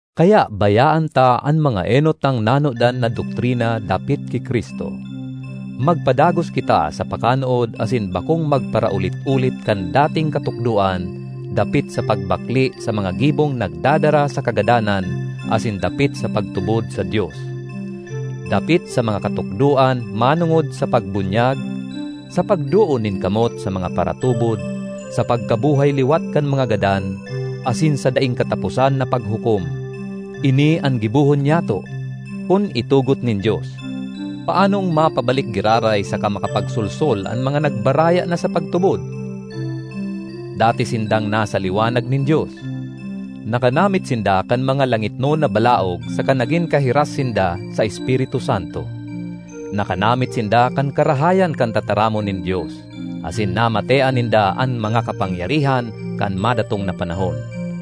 Kaya bayaan ta an mga enot tang nanodan na doktrina dapit ki Cristo. Magpadagos kita sa pakanood asin bakong magparaulit-ulit kan dating katukdoan dapit sa pagbakle sa mga gibong nagdadara sa kagadanan asin dapit sa pagtubod sa Dios; dapit sa mga katukdoan manongod sa pagbunyag, sa pagdoon nin kamot sa mga paratubod, sa pagkabuhay liwat kan mga gadan, asin sa daing kataposan na paghukom. Ini an gibohon nyato, kun itugot nin Dios. Paanong mapabalik giraray saka makapagsolsol an mga nagbaraya na sa pagtubod? Dati sindang nasa liwanag nin Dios. Nakanamit sinda kan mga langitnon na balaog saka nagin kahiras sinda sa Espiritu Santo. Nakanamit sinda kan karahayan kan tataramon nin Dios, asin namatean ninda an mga kapangyarihan kan madatong na panahon.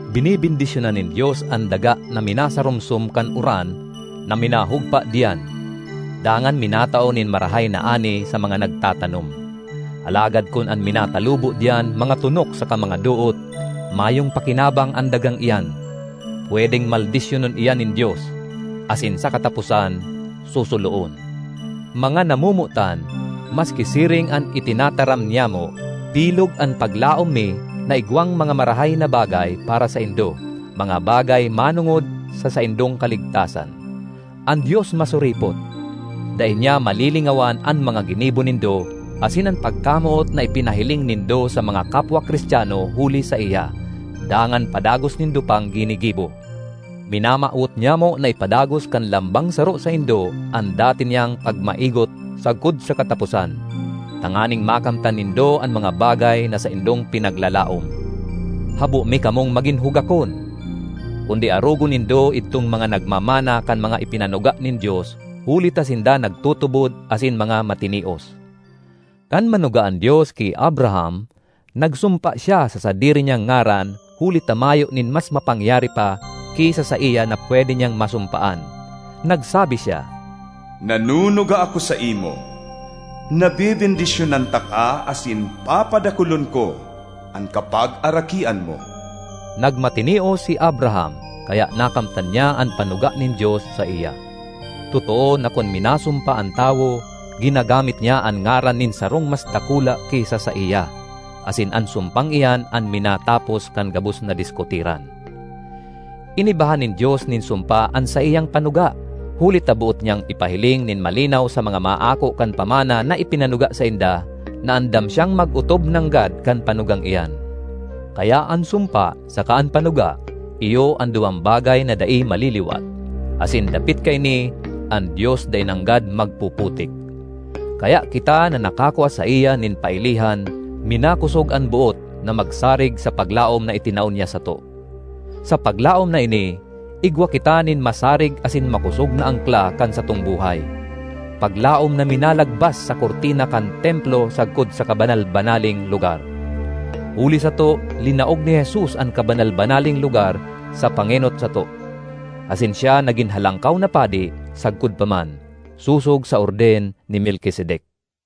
Benebendisyonan nin Dios an daga na minasarumsom kan uran na minahugpa diyan, dangan minatao nin marahay na ani sa mga nagtatanom. Alagad kun an minatalubo diyan mga tonok saka mga doot, mayong pakinabang an dagang iyan; pwedeng maldisyonon iyan nin Dios; asin sa kataposan, susuloon. Mga namomotan, maski siring an itinataram nyamo, bilog an paglaom mi na igwang mga marahay na bagay para saindo, mga bagay manongod sa saindong kaligtasan. An Dios masuripot. Dai niya malilingawan an mga ginibo nindo asin an pagkamoot na ipinahiling nindo sa mga kapwa Cristiano huli saiya, dangan padagos nindo pang ginigibo. Minamawot nyamo na ipadagos kan lambang saro saindo an dati niyang pagmaigot sagkod sa kataposan, tanganing makamtan nindo an mga bagay na saindong pinaglalaom. Habo mi kamong magin hugakon, kundi arogon nindo idtong mga nagmamana kan mga ipinanuga nin Dios huli ta sinda nagtutubod asin mga matinios. Kan manuga an Dios ki Abraham, nagsumpa siya sa sadiri niyang ngaran huli ta mayo nin mas mapangyari pa ki sa saiya na pwede niyang masumpaan. Nagsabi siya, “Nanunuga ako saimo na bebendisyonan taka asin papadakulon ko an kapagarakian mo.” Nagmatinios si Abraham, kaya nakamtan niya an panuga nin Dios saiya. Totoo na kun minasumpa an tawo, ginagamit niya an ngaran nin sarong mas dakula ki sa saiya, asin an sumpang iyan an minatapos kan gabos na diskutiran. Inibahan nin Dios nin sumpa an saiyang panuga, huli ta boot niyang ipahiling nin malinaw sa mga maako kan pamana na ipinanuga sainda, na andam siyang mag-otob nanggad kan panugang iyan. Kaya an sumpa saka an panuga iyo an duwang bagay na dai maliliwat, asin dapit kaini an Dios dai nanggad magpuputik. Kaya kita na nakakua saiya nin pailihan, minakosog an boot na magsarig sa paglaom na itinao niya sato. Sa paglaom na ini, igwa kita nin masarig asin makosog na angkla kan satong buhay; paglaom na minalagbas sa kurtina kan templo sagkod sa kabanal-banaleng lugar. Huli sato linaog ni Jesus an kabanal-banaleng lugar sa pangenot sato, asin siya nagin halangkaw na padi sagkod pa man, sosog sa orden ni Melkisedek.